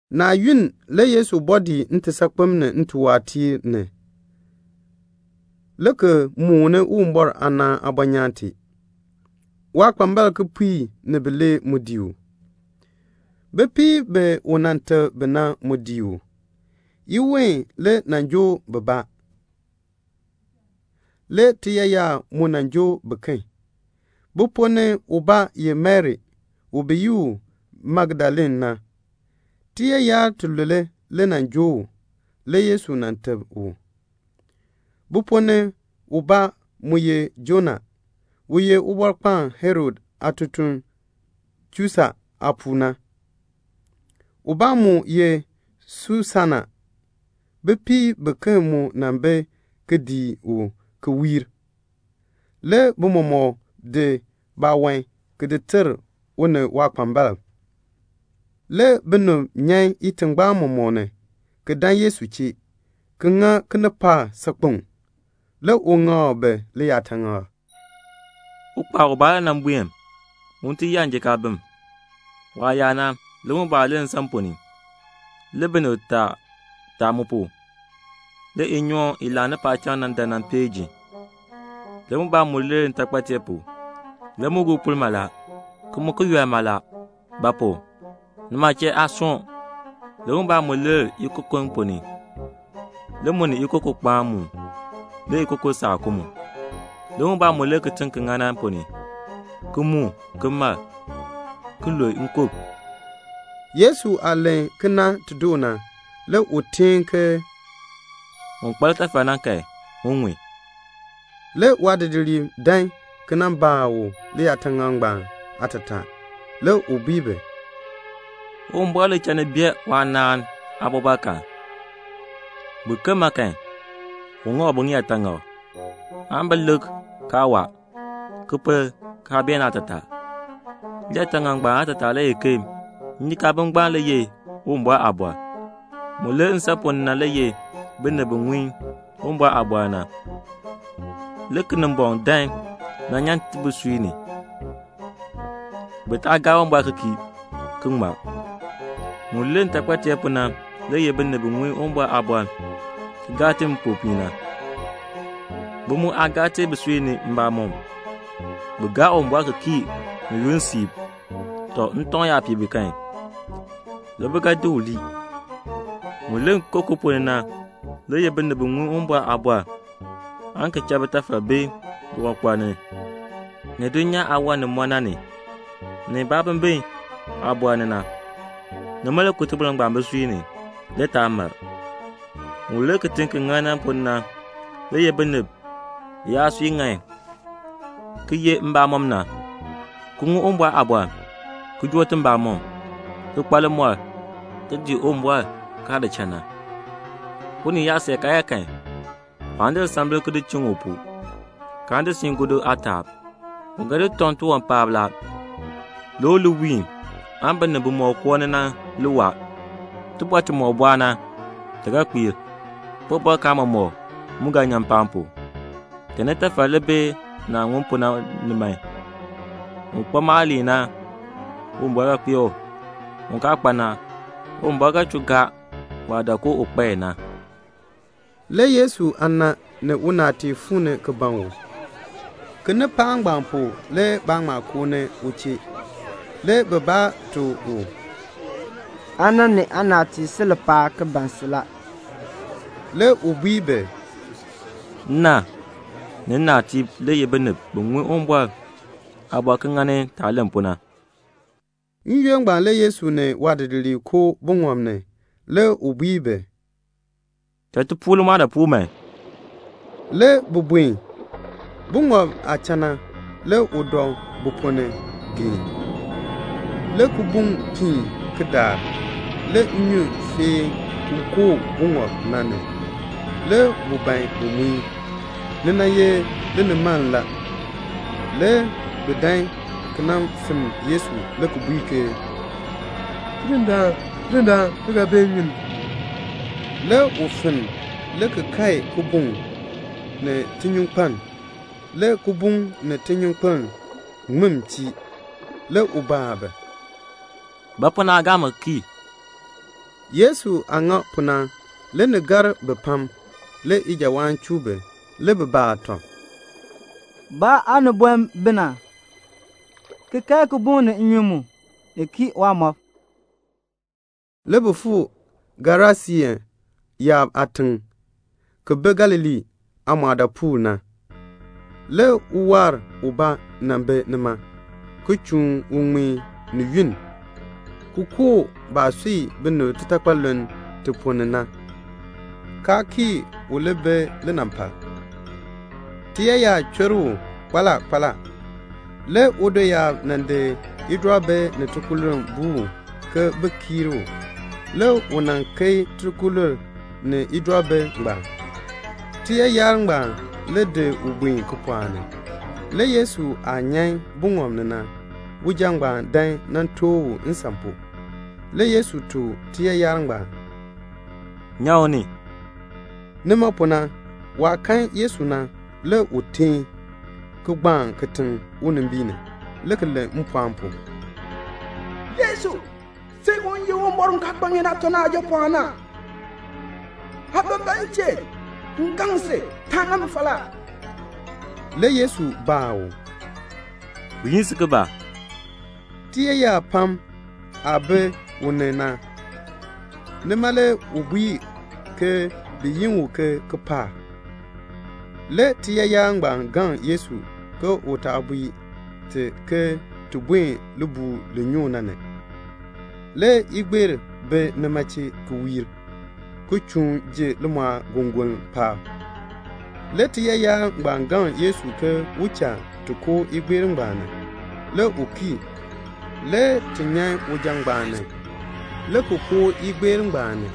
Naa yunn le Yesu bɔɔ dii ntisaakpem ni ntiwaatiir ni, le ki mooni Uwumbɔr aanaan aabɔnyaan tee. Waakpambalb kipiik ni bilee mu dii u. Bipiib bi u nan teb bi na mu dii u. Iween le nan joo bibaa. Le tiyaayar mu nan joo biken. Bi ponn ni ubaa ye Mari, bi yi u Magdalene. Tiyaayar tilule le nan joo u, le Yesu nan teb u. Bi ponn ni ubaa mu ye Joana, u ye Ubɔrkpaan Herod aatutuln Chusa aapuu na. Ubaa mu ye Susana. Bipiib biken mu bi ki dii u ki wiir. Le bi mɔmɔk di baawan ki di ter u ni waakpambalb. Le binib nyan itingbaan mɔmɔk ni, ki dan Yesu chee, ki ŋa kinipaak saakpeŋ. Le u ŋak bi liyaataŋakl: "Ukpaal ubaa le nan buen un ti yaa njikaabim. Waah yaa na, le mubaa lir nsan ponn ni. Le binib taa taa mu pu. Le inyoon i laani paacham na dan nan peei ji. Le mubaa mu lir ntaakpateer pu. Le mu guu puln mala, ki mu ki yɔl mala; ba pu? nima chee aa soon. Le mubaa mu lir ikokon ponn ni. Le mu ni ikokon kpaan muun. Le ikokon saa ku mu. Le mubaa mu lir kitiŋ ki ŋan na ponn ni, ki muun, ki mar, ki lu nkub." Yesu aah len kena ti doo na, le u teen ke "Un kpa litafal na kan, un ŋun." Le waadidiliib dan ki nan baa u liyaataŋakl ngbaan aatataa. Le u bui bi, "Uwumbɔr le cha ni bee waanaan aabɔbɔrkaan. Biken ma kan, u ŋak bi ŋiyaataŋak, aan bi lik kaa waa, ki pel kaa bee naatataa." "Liyaataŋakl ngbaan aatataa le ye ke njikaabim ngbaan le ye Uwumbɔr aaliin. Mu lir nsan ponn ni na le ye binib bi ŋun Uwumbɔr aaliin na. Le Kinimbɔŋ dan nan nyan i bisui ni, bi taa gaa Uwumbɔr ki kii, ki ŋmar. Mu lir ntaakpateer pu na le ye binib bi ŋun Uwumbɔr aaliin ki gaa i ni mpopiin na. Bi mu aa gaa i bisui ni mbamɔm. Bi gaa Uwumbɔr ki kii ni yunn siib; ntɔŋ yaa pii bi kan, le bi ga di u lii. Mu lir ikokon ponn ni na le ye binib bi ŋun Uwumbɔr aaliin na. Le bitafal bi liwankpal ni, ni dulnyaa aawan ni mɔ na ni, ni baabimbin aabɔr ni. Nima le ku iliin ngbaan bisui ni. Le yaa mar. Mu lir kitiŋ ki ŋan na ponn ni na le ye binib biyaasui ŋan ki ye mbamɔn na, ki ŋun Uwumbɔr aaliin, ki joo i mbamɔm, ki kpa limɔr, ki dii Uwumbɔr kaa di cha na." "Unii yaa see karyaa kan, waan di lisambil ki di chiŋ u pu, kaan di siin gɔdu aataab. U ga di u tɔŋ tiwan paab la, le u li wiin binib bimɔk koo ni na, bi li waa. Tibɔr timɔk bɔɔ na, ti ga kpiir. Tibɔbɔrkaan mɔmɔk mu ga nyan mpaan pu. "Cha nitafal li bi naah ŋun pu na ni man. Un kpa maaliin na, Uwumbɔr ga kpee u. Un kaa kpa na, Uwumbɔr ga chuu gaa waah dak ke u kpa i na." Le Yesu aana ni unaatiib fuu ni ki ban u. Kinipaak ngbaan pu le baa ŋma koo ni u chee. Le bibaa tuk u, "Aana ni aanaatiib si lipaal ki ban si la." Le u bui bi, "Nna ni nnaatiib le ye binib bimina bi ŋun Uwumbɔr aaliin ki ŋa yaah len pu na." N-yoonn ngbaan le Yesu ni waadidiliib koo buŋɔb ni. Le u bui bi, "Cha ti puur limɔɔdaapuul man." Le bi buen. Buŋɔb na aah cha na, le u dɔ bu ponn ni ki dɔ geen. Le kibuŋ piin ki daar. Le nnyun feei ki koo buŋɔb na ni, le bu ban bu gbii. Ni ye linimaln la. Le bi dan ki nan finn Yesu le ki bui ke "Tidindaan, Tidindaan, ti ga bee nnyun ni." Le u finn, le ki kae kibuŋ ni tinyunkpeln. Le kibuŋ ni tinyunkpeln ŋmin chii. Le u baa bi, "Ba pu naa gaa mi ki kii?" Yesu aah ŋa pu na, le ni gar bi pam. Le ijawaan chuu bi. Le bi baa tɔb, "Ba aaniboln bi na, ki kae kibuŋ ni nnyun mu, ni kii waamɔb." Le bi fuu Gerasiin yaab aatiŋ, ki bi Galilee aamɔɔdaapuul na. Le uwaar ubaa nan bi nima, ki chuun u ŋmeen, ni yunn, ki koo baah sui binib titakpaluln ti ponn ni na, kaa kii u li bi linampal. Tiyaayar chur u kpaala kpaala. Le udoyaab nan di idɔribi ni tikululn ki di buu u, bin kiir u. Le u nan keei tikululn ngbaan ni idɔribi. Tiyaayar ngbaan le di u buen kipɔɔk ni. Le Yesu aah nyan buŋɔb ni na, uja ngbaan dan nan tooh u nsan pu. Le Yesu tuk tiyaayar ngbaan, "Nyan u ni." Nima pu na waah kan Yesu na, le u teen, ki gbaan kitiŋ unimbiin ni, le ki len mpɔɔn pu, "Yesu, sin u ye Uwumbɔr u kaa kpa ŋeen aatɔ na Aajapɔɔn na, aa ban ba m chee? M gaŋ si, taa ŋa mi falaa." Le Yesu baa u, "Bi yi si ke ba?" Tiyaayar pam aah bi u ni na, nima le u bui ke bi yi u Kipaak. Le tiyaayar ngbaan gaŋ Yesu ke u taa bui ti ke ti buen libuul li nyoo na ni. Le igbeer bi nima chee ki wiir, ki chuun ji limɔɔgongoln paab. Le tiyaayar ngbaan gaŋ Yesu ke u cha ti koo igbeer ngbaan ni. Le u kii. Le ti nyan uja ngbaan ni, le ki koo igbeer na ni.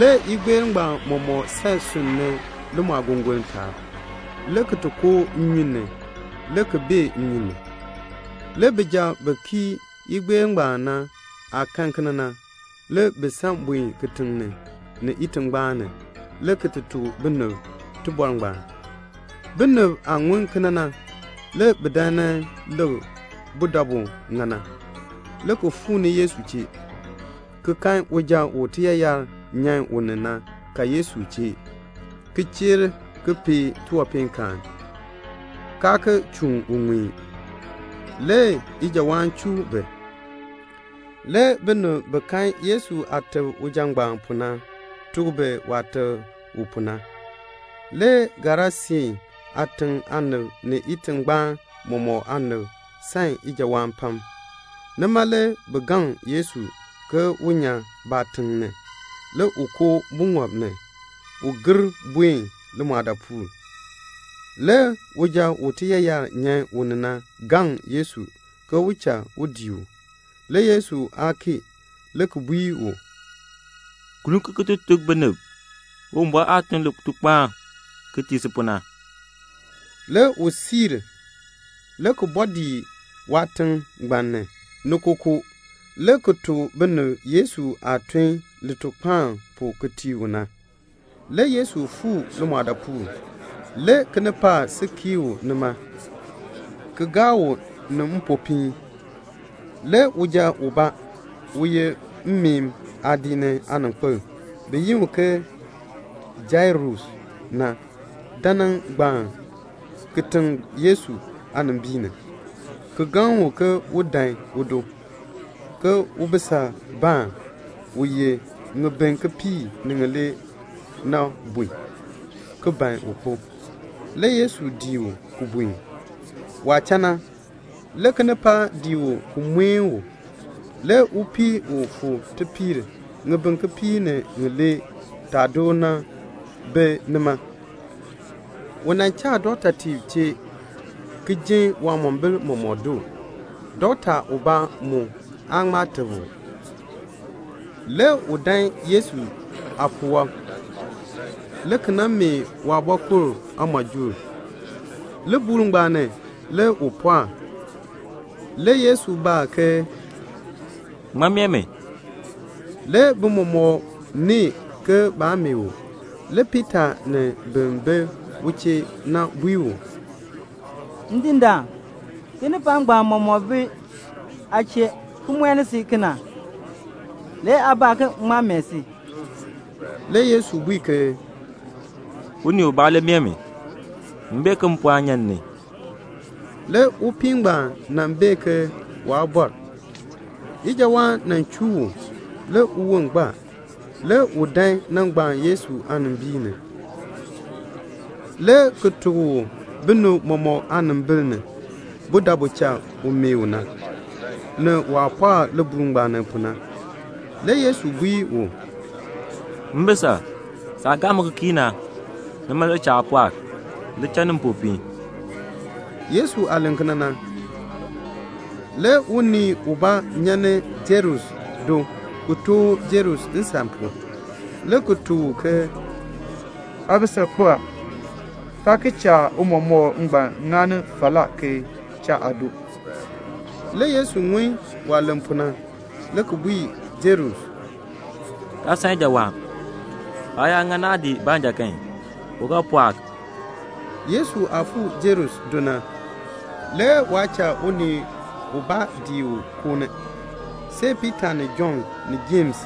Le igbeer mɔmɔk san sunn ni limɔɔgongoln taab, le ki koo nnyun ni, le ki bee nnyun ni. Le bijab bi kii igbeer ngbaan na aah kan kena na, le bi san buen kitiŋ ni, ni itingbaan ni, le ki ti tuk binib tibɔr ngbaan. Binib aah ŋun kena na, le bi dan bi nan lik budabu ŋa na, le ki fuu ni Yesu chee, ki kan uja u tiyaayar nyan u ni na ka Yesu chee ki cheer ki pee tiwanpeenkaan, kaa ki chuun u ŋmeen. Le ijawaan chuu bi. Le binib bi kan Yesu aah teb uja ngbaan pu na, tuk bi waah teb u pu na. Le Gerasiin aatiŋ aanib ni itingbaan mɔmɔk aanib san ijawaan pam. Nima le bi gaŋ Yesu ke un nyan baatiŋ ni. Le u koo buŋɔb ni, un ti gir buen limɔɔdaapuul. Le uja u tiyaayar nyan u ni na gaŋ Yesu ke u cha u dii u. Le Yesu aa kii, le ki bui u, "Gir kun ki ti tuk binib Uwumbɔr aah tun litukpaan ki tii si pu na." Le u buen, le ki bɔɔ dii waatiŋ ngbaan ni, ni kookoo, le ki tuk binib Yesu aah tun litukpaan pu ki tii u na. Le Yesu fuu limɔɔdaapuul. Le kinipaak si kii u nima, ki gaa u ni mpopiin. Le uja ubaa, u ye mmeen aadiik ni aaninkpil, bi yi u Jairus, dan nan gbaan kitiŋ Yesu aanimbiin ni, ki gaŋ u ke un dan udo, ke ubisabaan, u ye ŋibin kipiik ni ŋilee na bun, ki ban un kpo. Le Yesu dii u ki buen. Waah cha na, le kinipaak dii u ki mueni u. Le upii u fuu tipiir ŋibin kipiik ni ŋilee taa door na bi nima. U nan cha dɔktatiib chee, ki jin waamombil mɔmɔk doo. Dɔkta ubaa mu aa ŋma teb u. Le u dan Yesu aapuwɔb, le ki nan meeh waabɔkul aamɔjuul. Libuul ngbaan ni le u pɔɔk. Le Yesu baa ke, "Ŋmaa meeh mi?" Le bi mɔmɔk nee ke baa meeh u. Le Piita ni bin bi u chee na bui u, "Ndindaan, kinipaak ngbaan mɔmɔk le bi aa chee kena ki mueni si. Le aa baa ke ŋmaa meeh si?" Le Yesu bui ke "Unii ubaa le meeh mi. M bee ke mpɔɔn nyan m ni." Le upii ngbaan bee ke waa bɔr. Ijawaan chuu u, le uwon gbaa. Le u dan nan gbaan Yesu aanimbiin ni, le ki tuk u binib mɔmɔk aanimbil ni budabu cha u meeh u na, ni waah pɔɔk libuul ngbaan ni pu na. Le Yesu bui u, "Mbisal, saah gaa mi ki kii na, nima le cha aa pɔɔk. Li cha ni mpopiin." Yesu aah len kena na, le unii ubaa u nyan ni Jairus do na tooh Jairus nsan pu, le ki tuk u ke "Aabisal kpo a. Taa ki cha Tiicha ngbaan ŋani falaa ki cha aado." Le Yesu ŋun waah len pu na, le ki bui Jairus, "Taa san ijawaan. Aa yaa ŋa naadii baanja kan, u ga pɔɔk." Yesu aah fuu Jairus do na, le waa cha ubaa dii u ki koo ni, see Piita ni Jɔnn ni Jems,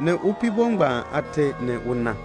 ni upiibo ngbaan aate ni una.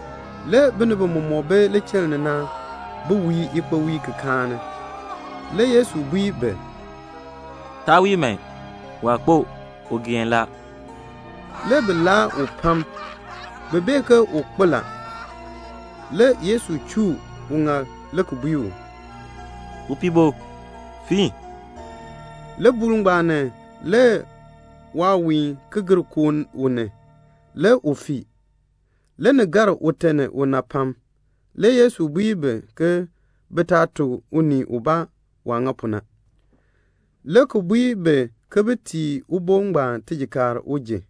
Le binib bimɔk bi lichiln ni na, bi wii ikpowiil ki kaani. Le Yesu bui bi, "Taa wii man. Waa kpo. U geen la." Le bi laa u pam. Bi bee ke u kpo la. Le Yesu chuu uŋaal le ki bui u, "Upiibo, fiin." Libuul ngbaan ni le waawiin ki gir koo u ni, le u fii. Le ni gar ute ni una pam. Le Yesu bui bi ke bi taa tuk unii ubaa waah ŋa pu na, le ki bui bi ke bin tii ubo ngbaan tijikaar un ji.